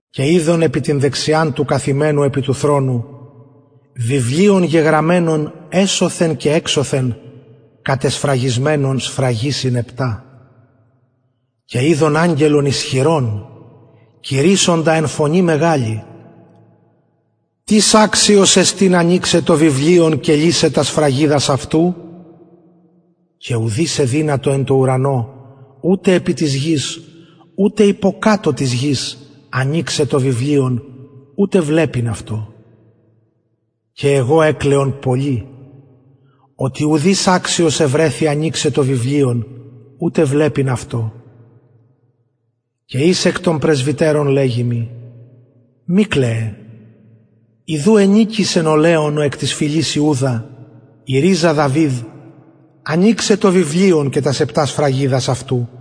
και ειδον επι την δεξιαν του καθημενου επι του θρονου βιβλιον γεγραμμενον εσωθεν και εξωθεν κατεσφραγισμενον σφραγισιν επτα και ειδον αγγελον ισχυρον κηρυσσοντα εν φωνη μεγαλη τις αξιος εστιν ανοιξαι το βιβλιον και λυσαι τας σφραγιδας αυτου και ουδεις εδυνατο εν τω ουρανω ανω ουτε επι της γης ουτε υποκατω της γης ανοιξαι το βιβλιον ουτε βλεπειν αυτο και εγω εκλαιον πολυ οτι ουδεις αξιος ευρεθη ανοιξαι το βιβλιον ουτε βλεπειν αυτο και εις εκ των πρεσβυτερων λεγει μοι μη κλαιε ιδου ενικησεν ο λεων ο εκ της φυλης ιουδα η ριζα δαυιδ ο ανοιγων το βιβλιον και τας επτα σφραγιδας αυτου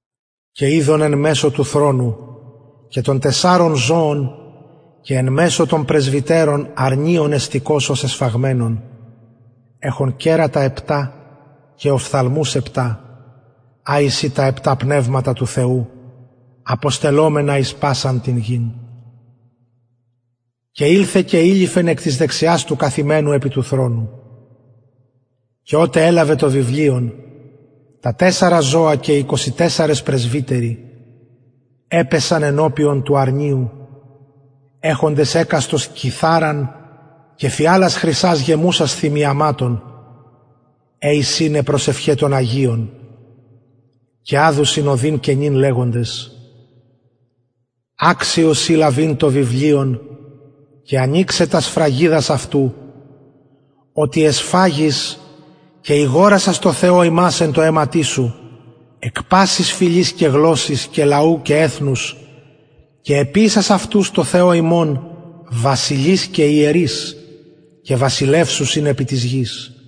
και ειδον εν μεσω του θρονου και των τεσσαρων ζωων και εν μεσω των πρεσβυτερων αρνιον εστηκος ως εσφαγμενον εχον κερατα επτα και οφθαλμους επτα α εισιν τα επτα πνευματα του θεου αποστελλομενα εις πασαν την γην και ηλθεν και ειληφεν εκ της δεξιας του καθημενου επι του θρονου και οτε ελαβεν το βιβλιον τα τεσσαρα ζωα και οι εικοσι τεσσαρες πρεσβυτεροι επεσον ενωπιον του αρνιου εχοντες εκαστος κιθαραν και φιαλας χρυσας γεμουσας θυμιαματων αι εισιν προσευχαι των αγιων και αδουσιν ωδην καινην λεγοντες αξιος ει λαβειν το βιβλιον και ανοιξαι τας σφραγιδας αυτου οτι εσφαγης και ηγορασας τω θεω ημας εν τω αιματι σου εκ πασης φυλης και γλωσσης και λαου και εθνους και εποιησας αυτους τω θεω ημων βασιλεις και ιερεις και βασιλευσουσιν επι της γης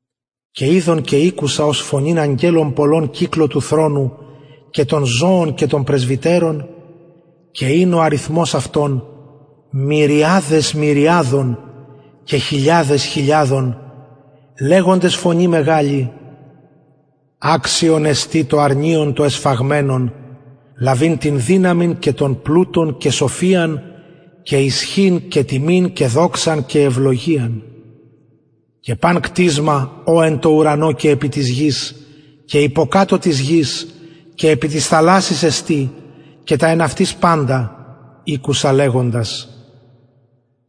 και ειδον και ηκουσα ως φωνην αγγελων πολλων κυκλω του θρονου και των ζωων και των πρεσβυτερων και ην ο αριθμος αυτων μυριαδες μυριαδων και χιλιαδες χιλιαδων λεγοντες φωνη μεγαλη αξιον εστιν το αρνιον το εσφαγμενον λαβειν την δυναμιν και τον πλουτον και σοφιαν και ισχυν και τιμην και δοξαν και ευλογιαν και παν κτισμα ο εν τω ουρανω και επι της γης και υποκατω της γης και επι της θαλασσης εστιν και τα εν αυτοις παντας ηκουσα λεγοντας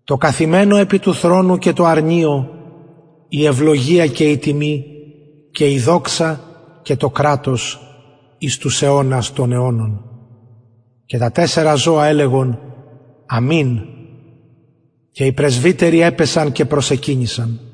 τω καθημενω επι του θρονου και τω αρνιω η ευλογια και η τιμη και η δοξα και το κρατος εις τους αιωνας των αιωνων αμην και τα τεσσαρα ζωα λεγοντα το αμην και οι πρεσβυτεροι επεσον και προσεκυνησαν